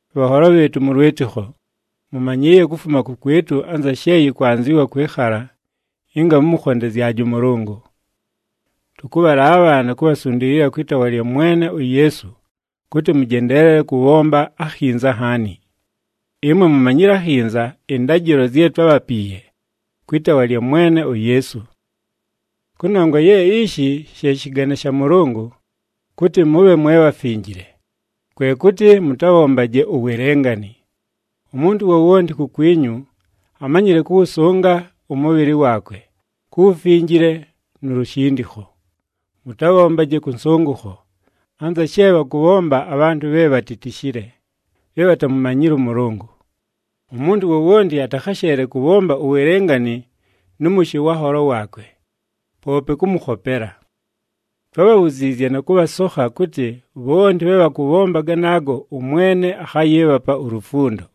Bhanholo bhɨɨtʉ mʉ lwɨtɨkho, mʉmanyɨɨye kufuma kʉkwɨtʉ anza she yɨkwanzɨwa kwɨkhala ɨnga mʉmʉkhondezyaje ʉMʉlʉngʉ. Tʉkʉbhalaabha na kubhasundiilila kwɨ taawa lya Mwene uYeesu kʉtɨ mʉjendeelele kʉbhomba akhinza nhaani. Ɨmwe mumanyile akhinza ɨndajɨlo zye twábhapiiye kwɨ taawa lya Mwene uYeesu. Kʉnongwa ye ishi she shɨgane sha Mʉlʉngʉ, kʉtɨ mʉbhe mwe bhafinjile, kwe kʉtɨ mʉtabhombaje uwelengani. Umuntu wowonti kukwinyu amanyɨle kʉwʉsʉnga ʉmʉbhɨlɨ waakwe, ku wufinjile nu lushindikho. Mʉtabhombaje kʉ nsʉngʉkho, anza she bhakʉbhomba abhantʉ bhe bhatitishile, bhe bhatamumanyile ʉMʉlʉngʉ. Umuntu wowonti atakhasheele kʉbhomba uwelengani nʉ mʉshɨ wa nholo waakwe, poope kʉmʉkhopela. Twábhabhuziizye na kʉbhasokha kʉtɨ bhonti bhe bhakʉbhomba ganaago ʉMwene akhayɨɨbhapa ulufundo.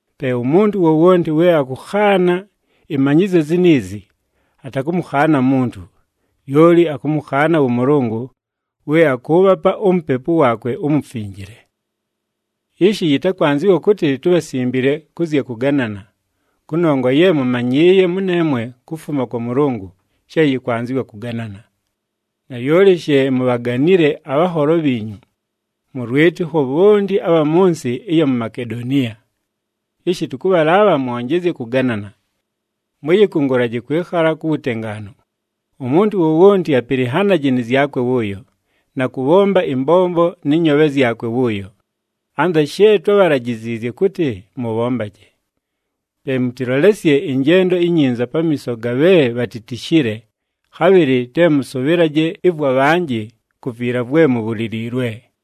Pe umuntu wowonti we akʉkhaana ɨmanyɨzyo ziniizi, atakʉmʉkhaana muntu, lyoli akʉmʉkhaana wʉ Mʉlʉngʉ, we akʉʉbhapa uMupepu waakwe uMufinjile. Ishi yɨtakwanzɨwa kʉtɨ tubhasimbile kʉ zya kʉganana, kʉnongwa ye mʉmanyɨɨye mʉneemwe kufuma kwa Mʉlʉngʉ she yɨkwanzɨwa kʉganana. Nalyoli she mubhaganile abhanholo bhiinyu mʉ lwɨtɨkho bhonti abha mʉ nsɨ ɨya mu Makedoniya. Ishi tʉkʉbhalaabha mwonjezye kʉganana. Mʉyɨkʉngʉlaje kwɨkhala ku wutengaanu, umuntu wowonti apɨlɨnhanaje nɨ zyakwe wʉʉyo, na kʉbhomba ɨmbombo nɨ nyoobhe zyakwe wʉʉyo, anza she twábhalajiziizye kʉtɨ mʉbhombaje. Pe mʉtɨlolesye ɨnjendo inyinza pamiiso ga bhe bhatitishile, khabhɨlɨ te mʉsʉbhɨlaje ɨvwa bhanjɨ ku viila vwe mubhuliliilwe.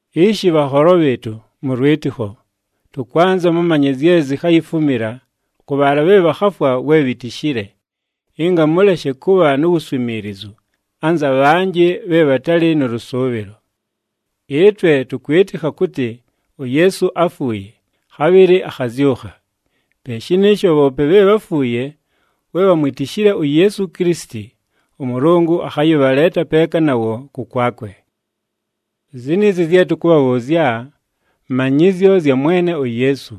Ishi bhanholo bhɨɨtʉ mʉ lwɨtɨkho, tʉkwanza mʉmanye zye zikhayifumila kʉ bhaala bhe bhakhafwa we bhitishile, ɨnga mʉleshe kʉbha nu wuswimiilizu anza bhanjɨ bhe bhatalɨ nʉ lʉsʉʉbhɨlo. Ɨtwe tʉkwɨtɨkha kʉtɨ uYeesu áfuuye, khabhɨlɨ akhazyʉkha. Pe shɨnɨɨsho bhoope bhe bháfuuye we bhamwitishile uYeesu Kilisiti, ʉMʉlʉngʉ akhayɨbhaleeta peeka nawo kʉkwakwe. Ziniizi zye tʉkʉbhabhʉʉzya manyɨzyo zya Mwene uYeesu,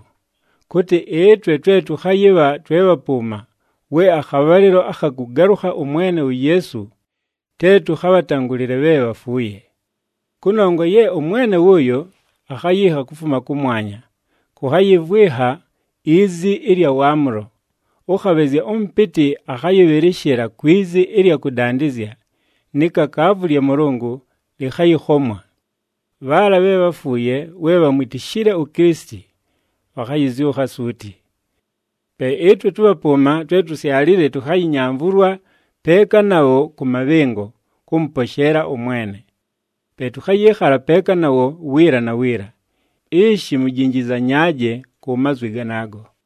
kʉtɨ ɨtwe twe tʉkhayɨbha twe bhapʉʉma we akhabhalɨlo akha kʉgalʉkha ʉMwene uYeesu, te tʉkhabhatangʉlɨle bhe bhafuuye. Kʉnongwa ye ʉMwene wʉʉyo akhayiikha kufuma kʉmwanya, kʉkhayɨvwɨnha izi ɨlya waamʉlo, ʉkhabhɨzya ʉmʉpɨtɨ akhayɨbhɨlɨshɨla kwi zi ɨlya kʉdandɨzya ni kakaavu lya Mʉlʉngʉ lɨkhayɨkhomwa. Bhaala bhe bháfuuye we bhamwitishile uKilisiti, bhakhayɨzyʉkha suuti. Pe ɨtwe tʉbhapʉʉma, twe tusyalile tʉkhayɨnyamvʉlwa peeka nabho kʉ mabhɨngo, kʉmʉposheela ʉMwene. Pe tʉkhayɨɨkhala peeka nawo wiila na wiila. Ishi mujinjizanyaaje ku mazwi ganaago.